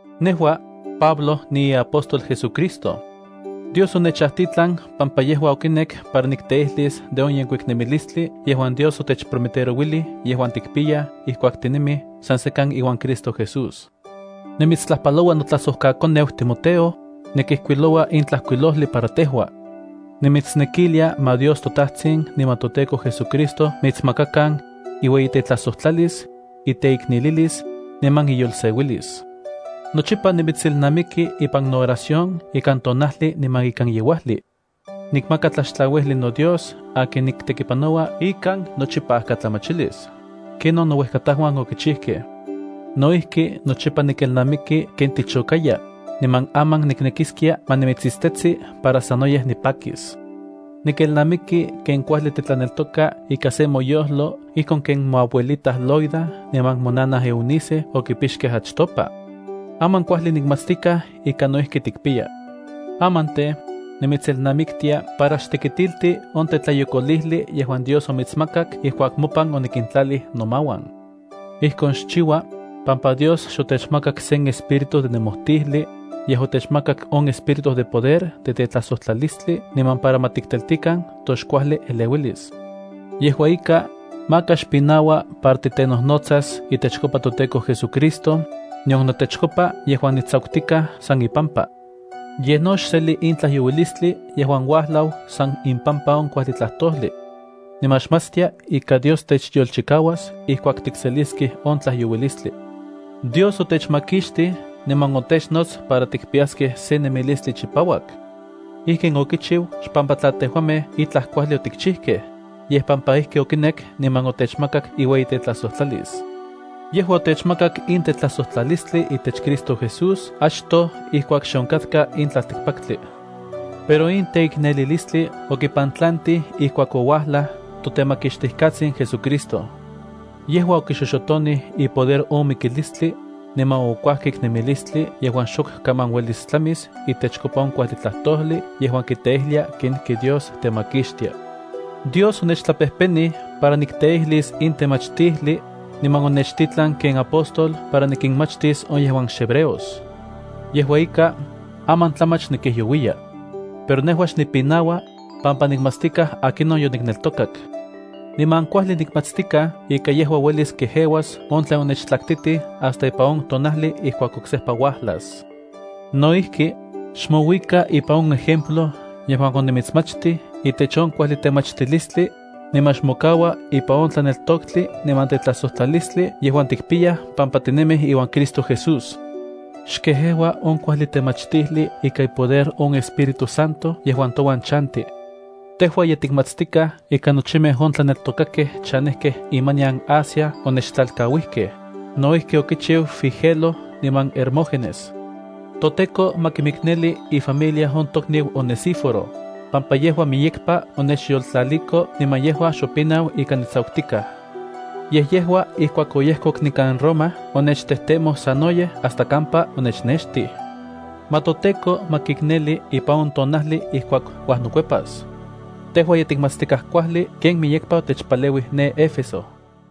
Nejua, Pablo, niiapóstol JesuCristo. Dios onechajtitlan pampa yejua okinek para nikteijlis de on yenkuik nemilistli yejuan Dios otechprometerouilij yejuan tikpiyaj ijkuak tinemij san sekan iuan Cristo Jesús. Nimitstlajpaloua notlajsojkakoneu Timoteo, nikijkuiloua in tlajkuilojli para tejua. Nimitsnekilia ma Dios toTajtsin niman toTEKO JesuCristo mitsmakakan, inueyitetlajsojtlalis, inteiknelilis, niman inyolseuilis. Nochipa nimitselnamiki ipan nooración ikan tonajli niman ikan yeuajli. Nikmaka tlaxtlauijli noDios akin niktekipanoua ikan nochipajkatlamachilis, ken on nouejkatajuan okichijkej. No ijki nochipa nikelnamiki ken tichokaya, niman aman niknekiskia ma nimitsitstetsi para sanoyej nipakis. Nikelnamiki ken kuajli titlaneltoka ika se moyojlo ijkon ken moabuelita Loida niman monanaj Eunice okipixkej achtopa. Aman kuajli nikmatstikaj ika no ijki tikpiya. Aman tej, nimitselnamiktia para xtekitilti on tetlayokolijli yejuan Dios omitsmakak ijkuak mopan onikintlalij nomauan. Ijkon xchiua, pampa Dios xotechmakak sen espíritu de nemojtijli, yej otechmakak on espíritu de poder de tetlajsojtlalistli niman para ma tikteltikan toxkuajli eleuilis. Yejua ika, maka xpinaua para titenojnotsas itechkopa toTEKO JesuCristo, nion notechkopa yejuan nitsakutikaj san ipampa. Yej no xseli in tlajyouilistli yejuan uajlau san ipampa in kuajli tlajtojli. Niman xmatstia ika Dios techyolchikauas ijkuak tikseliskej on tlajyouilistli. Dios otechmakixtij niman otechnots para tikpiyaskej sen nemilistli chipauak. Ijkin okichiu xpampa tla tejuamej itlaj kuajli otikchijkej, yej pampa ijki okinek niman otechmakak iueyitetlajsojtlalis. Yejua otechmakak in tetlajsojtlalistli itech Cristo Jesús achtoj ijkuak xe onkatka in tlaltikpaktli. Pero in teiknelilistli okipantlantij ijkuak ouajlaj toTemakixtijkatsin JesuCristo. Yejua okixoxotonij ipoder on mikilistli, niman okuajkik nemilistli yejuan xok kaman uelis tlamis itechkopa on kuajli tlajtojli yejuan kiteijlia kenijki Dios temakixtia. Dios onechtlapejpenij para nikteijlis in temachtijli, niman onechtitlan ken apóstol para nikinmachtis on yejuan xhebreos. Yejua ika, aman tlamach nikijyouiya. Pero nejua xnipinaua, pampa nikmatstikaj akinon yonikneltokak. Niman kuajli nikmatstikaj ika yejua uelis kejeuas on tlen onechtlaktitij hasta ipan on tonajli ijkuak oksejpa uajlas. No ijki, xmouika ipan on ejemplo yejuan onimitsmachtij itech on kuajli temachtilistli, niman xmokaua ipan on tlaneltoktli niman tetlajsojtlalistli yejuan tikpiyaj pampa tinemij iuan Cristo Jesús. Xkejeua on kuajli temachtijli ika ipoder on Espíritu Santo yejuan touan chanti. Tejua ye tikmatstikaj ika nochimej on tlaneltokakej chanejkej imanian Asia onechtlalkauijkej, no ijki okichiu Figelo niman Hermógenes. ToTEKO ma kimikneli ifamilia on tokniu Onesíforo, pampa yejua miyekpa onechyoltlaliko, niman yejua xopinau ika nitsakutikaj. Yej yejua ijkuak oyejkok nikan Roma onechtejtemoj sanoyej hasta kampa onechnextij. Ma toTEKO ma kikneli ipan on tonajli ijkuak uajnokuepas. Tejua ye tikmatstikaj kuajli ken miyekpa otechpaleuij ne Éfeso.